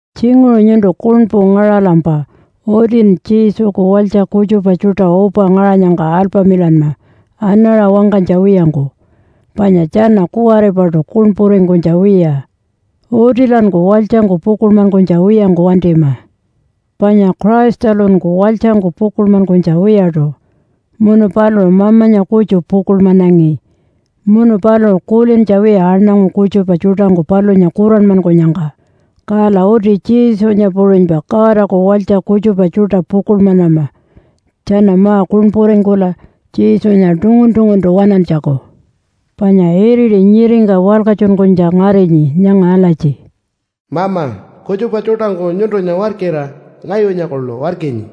Tjinguṟu nyuntu kuṉpu ngaṟalampa utin Jesuku walytja kutjupa tjuṯa upa ngaṟanyangka alpamilanma anaṟa wangkanytja wiyangku, panya tjana kuwaripaṯu kuṉpuringkunytja wiya. Utilanku walytjangku pukuḻmankunytja wiyangku wantima. Panya Christalunku walytjangku pukuḻmankunytja wiyaṯu, munu paluṟu Mamanya kutju pukuḻmanangi munu paluṟu kulintja wiya aṉangu kutjupa tjuṯangku palunya kuranmankunyangka. Kala uti Jesunya puṟunypa Godaku walytja kutjupa tjuṯa pukuḻmanama tjana ma-kuṉpuringkula Jesunya tungun-tunguntu waṉantjaku. Panya iriti nyiringka walkatjunkunytja ngarinyi nyanga alatji, “Mama, kutjupa tjuṯangku nyuntunya warkira ngayunya kuḻu warkinyi.”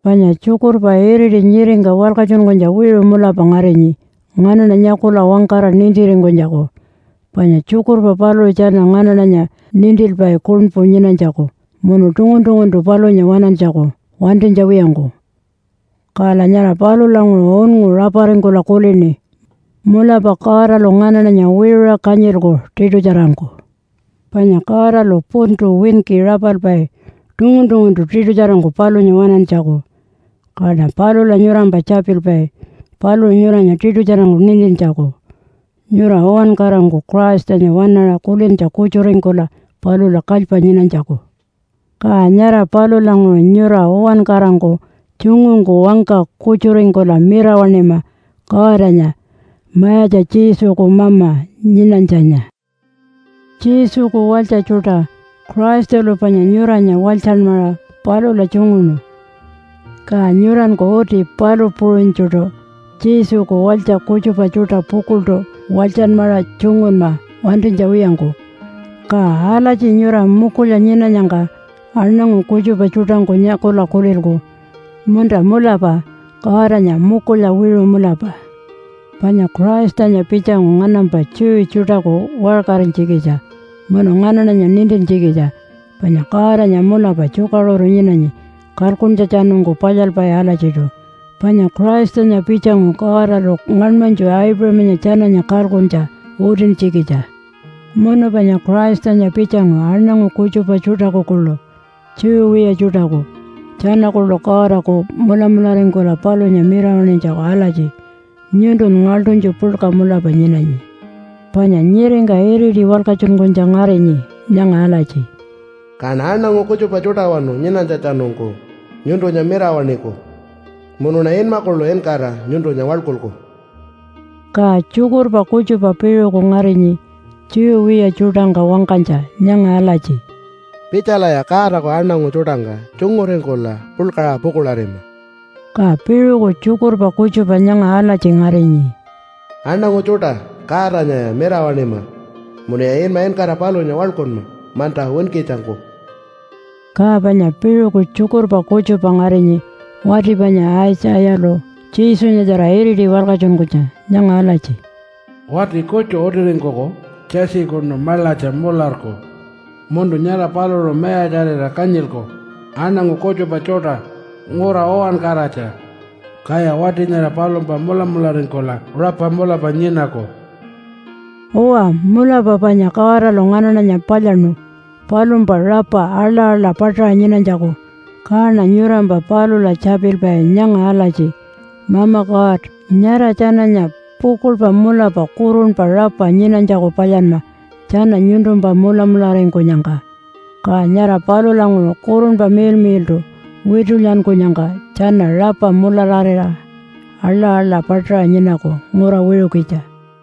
Panya tjukurpa iriti nyiringka walkatjunkunytja wiṟu mulapa ngarinyi nganaṉa nyakula wangkara nintiringkunytjaku. Panya tjukurpa paluṟu tjana nganaṉanya nintilpai kuṉpu nyinanytjaku munu tungun-tunguntu palunya waṉantjaku wantinytja wiyangku. Kala nyara palulanguṟu unngu raparingkula kulini, “Mulapa Godalu nganaṉanya wiṟuṟa kanyilku tiṯutjarangku.” Panya Godalu puntu winki rapalpai tungun-tunguntu tiṯutjarangku palunya waṉantjaku. Kaṉa palula nyurampa tjapilpai paluṟu nyuranya tiṯutjarangku nintintjaku nyura uwankarangku Christanya waṉaṟa kulintja kutjuringkula palula kalypa nyinanytjaku. Ka nyara palulanguṟu nyura uwankarangku tjungungku wangka kutjuringkula mirawaṉima Godanya, Mayatja Jesuku Mama nyinanytjanya. Jesuku walytja tjuṯa! Christalu panya nyuranya walytjanmaṟa palula tjunguṉu, ka nyuranku uti palu puṟunytjuṯu Jesuku walytja kutjupa tjuṯa pukuḻṯu walytjanmaṟa tjungunma wantinytja wiyangku. Ka alatji nyura mukulya nyinanyangka aṉangu kutjupa tjuṯangku nyakula kulilku, “Munta, mulapa Godanya mukulya wiṟu mulapa.” Panya Christanya pitjangu nganampa Jew tjuṯaku waṟkarinytjikitja munu nganaṉanya nintintjikitja panya Godanya mulapa tjukaṟuru nyinanyi kalkuntjatjanungku palyalpai alatjiṯu. Panya Christanya pitjangu Godalu ngaṉmanytju Aipuṟamanya tjananya kalkuntja utintjikitja. Munu panya Christanya pitjangu aṉangu kutjupa tjuṯaku kuḻu, Jew wiya tjuṯaku, tjana kuḻu Godaku mulamularingkula palunya mirawaṉinytjaku alatji, “Nyuntun ngaḻṯunytju puḻka mulapa nyinanyi.” Panya nyiringka iriti walkatjunkunytja ngarinyi nyanga alatji, “Kaṉa aṉangu kutjupa tjuṯawanu nyinanytjatjanungku nyuntunya mirawaṉiku. Munuṉa inma kuḻu inkara nyuntunya waḻkulku.” Ka tjukurpa kutjupa piṟuku ngarinyi Jew wiya tjuṯangka wangkanytja nyanga alatji, “Pitjalaya Godaku aṉangu tjuṯangka tjunguringkula puḻkaṟa pukuḻarima.” Ka piṟuku tjukurpa kutjupa nyanga alatji ngarinyi, “Aṉangu tjuṯa, Godanyaya mirawaṉima! Munuya inma inkara palunya waḻkunma, manta winkitjangku.” Ka panya piṟuku tjukurpa kutjupa ngarinyi wati panya Aitjayalu Jesunyatjara iriti walkatjunkunytja nyanga alatji, “Wati kutju utiringkuku Jesse-kunu maḻatja mularku. Munu nyara paluṟu mayatjarira kanyilku aṉangu kutjupa tjuṯa ngura uwankaratja. Kaya wati nyara palumpa mulamularingkula rapa mulapa nyinaku.” Uwa, mulapa panya Godalu nganaṉanya palyaṉu palumpa rapa aḻa-aḻa paṯaṟa nyinanytjaku. Kaṉa nyurampa palula tjapilpai nyanga alatji, “Mama God, nyara tjananya pukuḻpa mulapa kurunpa rapa nyinanytjaku palyanma tjana nyuntumpa mulamularingkunyangka. Ka nyara palulanguṟu, Kurunpa Miḻmiḻṯu witulyankunyangka, tjana rapa mulararira aḻa-aḻa paṯaṟa nyinaku ngura wiṟukitja.”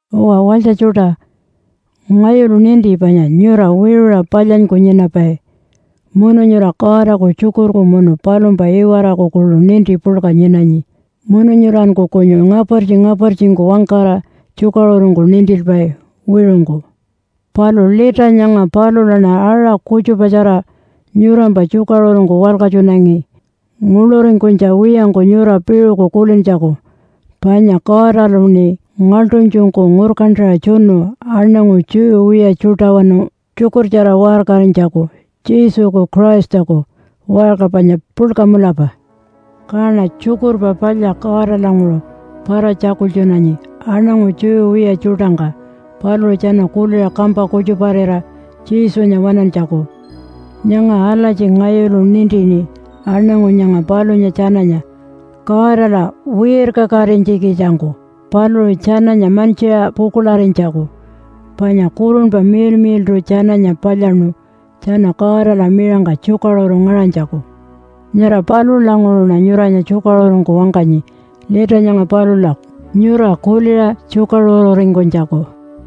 Uwa walytja tjuṯa, ngayulu ninti panya nyura wiṟuṟa palyanyku nyinapai. Munu nyura Godaku tjukurku munu palumpa iwaraku kuḻu ninti puḻka nyinanyi. Munu nyuranku kunyu ngapartji-ngapartjingku wangkara tjukaṟurungku nintilpai wiṟungku. Palu lita nyanga palulaṉa aṟa kutjupatjara nyurampa tjukaṟurungku walkatjunangi nguḻuringkunytja wiyangku nyura piṟuku kulintjaku. Panya Godaluṉi ngaḻṯunytjungku ngurkantaṟa tjunu aṉangu Jew wiya tjuṯawanu tjukurtjara waṟkarinytjaku Jesuku Christaku, waṟka panya puḻka mulapa. Kaṉa Tjukurpa Palya Godalanguṟu para-tjakultjunanyi aṉangu Jew wiya tjuṯangka paluṟu tjana kuliṟa kampa kutjuparira Jesunya waṉantjaku. Nyanga alatji ngayulu nintini aṉangu nyanga palunya tjananya Godala wirkakatinytjikitjangku paluṟu tjananya mantjiṟa pukuḻarinytjaku, panya Kurunpa Miḻmiḻṯu tjananya palyaṉu tjana Godala miṟangka tjukaṟuru ngaṟanytjaku. Nyara palulanguṟuṉa nyuranya tjukaṟurungku wangkanyi lita nyanga palula nyura kuliṟa tjukaṟururingkunytjaku.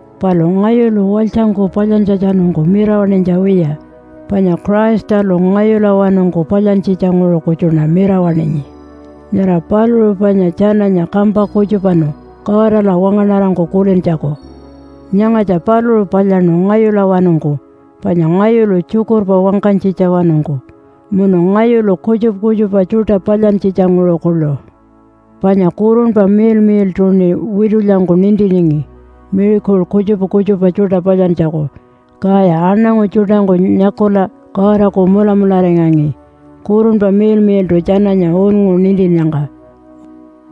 Palu ngayulu walytjangku palyantjatjanungku mirawaṉinytja wiya, panya Christalu ngayulawanungku palyantjitjanguṟu kutjuṉa mirawaṉinyi. Nyara paluṟu panya tjananya kampa kutjupanu Godala wangaṉarangku kulintjaku. Nyangatja paluṟu palyaṉu ngayulawanungku panya ngayulu tjukurpa wangkanytjitja-wanungku munu ngayulu kutjupa kutjupa tjuṯa palyantjitja-nguṟu kuḻu. Panya Kurunpa Miḻmiḻṯuṉi witulyangku nintiningi miracle kutjupa kutjupa tjuṯa palyantjaku, kaya aṉangu tjuṯangku nyakula Godaku mulamularingangi, Kurunpa Miḻmiḻṯu tjananya unngu nintinnyangka.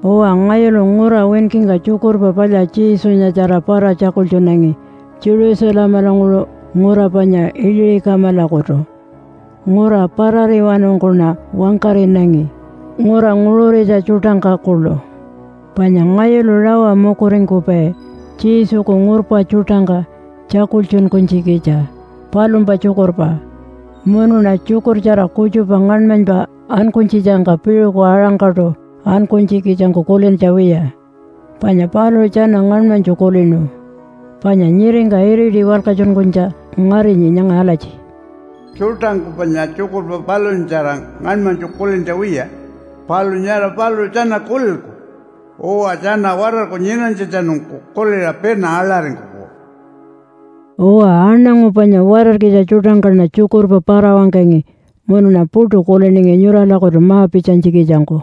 Uwa, ngayulu ngura winkingka Tjukurpa Palya Jesunyatjara para-tjakultjunangi Jerusalemalanguṟu ngura panya Iliṟi-kamalakutu. Ngura parariwanungkuṉa wangkaṟinangi, ngura nguṟuritja tjuṯangka kuḻu. Panya ngayulu rawa mukuringkupai Jesuku ngurpa tjuṯangka tjakultjunkunytjikitja palumpa tjukurpa. Munuṉa tjukurtjara kutjupa ngaṉmanypa ankunytjitjangka piṟuku aṟangkaṯu ankunytjikitjangku kulintja wiya, panya paluṟu tjana ngaṉmanytju kulinu. Panya nyiringka iriti walkatjunkunytja ngarinyi nyanga alatji, “Tjuṯangku panya tjukurpa palunyatjara ngaṉmanytju kulintja wiya, palu nyara paluṟu tjana kulilku. Uwa tjana watarku nyinanytjatjanungku kuliṟa pina aḻaringkuku.” Uwa, aṉangu panya watarkitja tjuṯangkaṉa tjukurpa para-wangkangi munuṉa puṯu kuliningi nyuralakutu ma-pitjanytjikitjangku.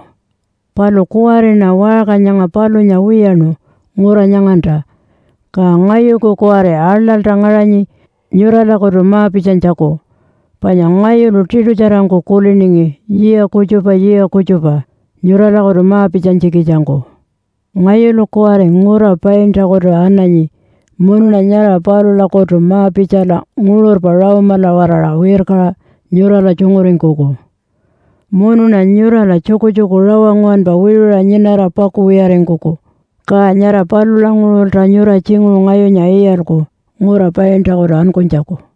Palu kuwariṉa waṟka nyanga palunya wiyaṉu ngura nyanganta, ka ngayuku kuwari aḻalta ngaṟanyi nyuralakutu ma-pitjanytjaku, panya ngayulu tiṯutjarangku kuliningi yiya kutjupa yiya kutjupa nyuralakutu ma-pitjanytjikitjangku. Ngayulu kuwari ngura Paintakutu ananyi munuṉa nyara palulakutu ma-pitjala nguṟurpa Rome-ala-waraṟa wirkaṟa nyurala tjunguringkuku. Munuṉa nyurala tjukutjuku rawa nguwanpa wiṟuṟa nyinara pakuwiyaringkuku, ka nyara palulanguṟulta nyura tjinguṟu ngayunya iyalku ngura Paintakutu ankunytjaku.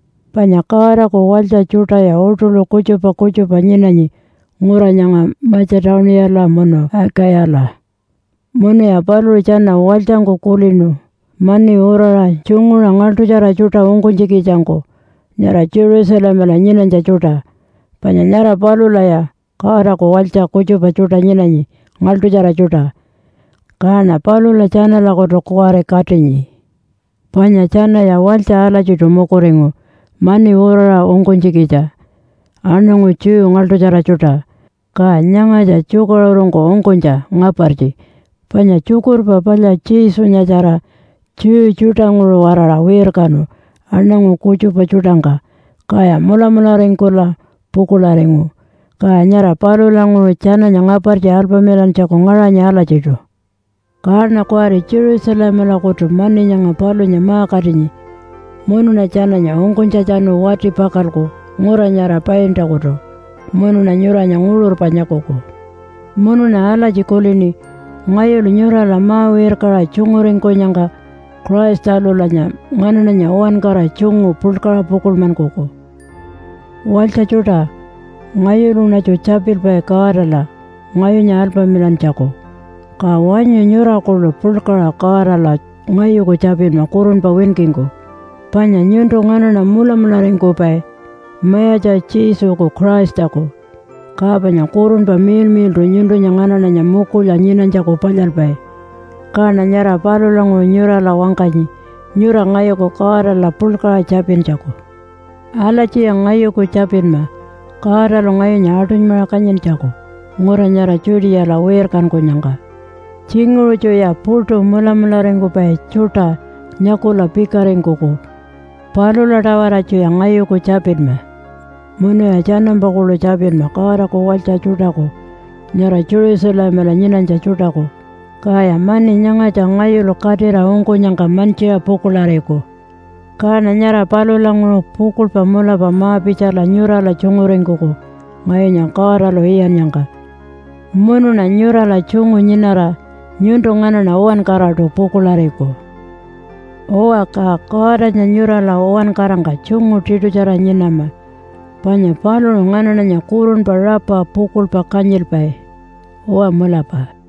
Panya Godaku walytja tjuṯaya uṯuḻu kutjupa kutjupa nyinanyi ngura nyanga Matja-tuniyala munu Akayala. Munuya paluṟu tjana walytjangku kulinu mani uraṟa tjunguṟa ngaḻṯutjara tjuṯa ungkunytjikitjangku nyara Jerusalemala nyinanytja tjuṯa. Panya nyara palulaya Godaku walytja kutjupa tjuṯa nyinanyi ngaḻṯutjara tjuṯa, kaṉa palula tjanalakutu kuwari katinyi. Panya tjanaya walytja alatjiṯu mukuringu mani uraṟa ungkunytjikitja aṉangu Jew ngaḻṯutjara tjuṯa. Ka nyangatja tjukaṟurungku ungkunytja ngapartji, panya Tjukurpa Palya Jesunyatjara Jew tjuṯanguṟu-waraṟa wirkanu aṉangu kutjupa tjuṯangka kaya mulamularingkula pukuḻaringu, ka nyara palulanguṟu tjananya ngapartji alpamilantjaku ngaṟanyi alatjiṯu. Kaṉa kuwari Jerusalemalakutu mani nyanga palunya ma-katinyi munuṉa tjananya ungkunytjatjanu wati-pakalku ngura nyara Paintakutu, munuṉa nyuranya nguṟurpa nyakuku. Munuṉa alatji kulini, “Ngayulu nyurala ma-wirkaṟa tjunguringkunyangka Christalulanya nganaṉanya uwankara tjungu puḻkaṟa pukuḻmankuku.” Walytja tjuṯa, ngayuluṉatju tjapilpai Godala ngayunya alpamilantjaku, ka wanyu nyura kuḻu puḻkaṟa Godala ngayuku tjapinma kurunpa winkingku. Panya nyuntu nganaṉa mulamularingkupai Mayatja Jesuku Christaku. Ka panya Kurunpa Miḻmiḻṯu nyuntunya nganaṉanya mukulya nyinanytjaku palyalpai. Kaṉa nyara palulanguṟu nyurala wangkanyi nyura ngayuku Godala puḻkaṟa tjapintjaku. Alatjiya ngayuku tjapinma Godalu ngayunya aṯunymaṟa kanyintjaku ngura nyara Judeala wirkankunyangka. Tjinguṟutjuya puṯu mulamularingkupai tjuṯa nyakula pikaringkuku, palula-tawaratjuya ngayuku tjapinma. Munuya tjanampa kuḻu tjapinma Godaku walytja tjuṯaku nyara Jerusalemala nyinanytja tjuṯaku, kaya mani nyangatja ngayulu katira ungkunyangka mantjiṟa pukuḻariku. Kaṉa nyara palulanguṟu pukuḻpa mulapa ma-pitjala nyurala tjunguringkuku ngayunya Godalu iyannyangka. Munuṉa nyurala tjungu nyinara nyuntu nganaṉa uwankaraṯu pukuḻariku. Uwa, ka Godanya nyurala uwankarangka tjungu tiṯutjara nyinama, panya paluṟu nganaṉanya kurunpa rapa pukuḻpa kanyilpai. Uwa mulapa.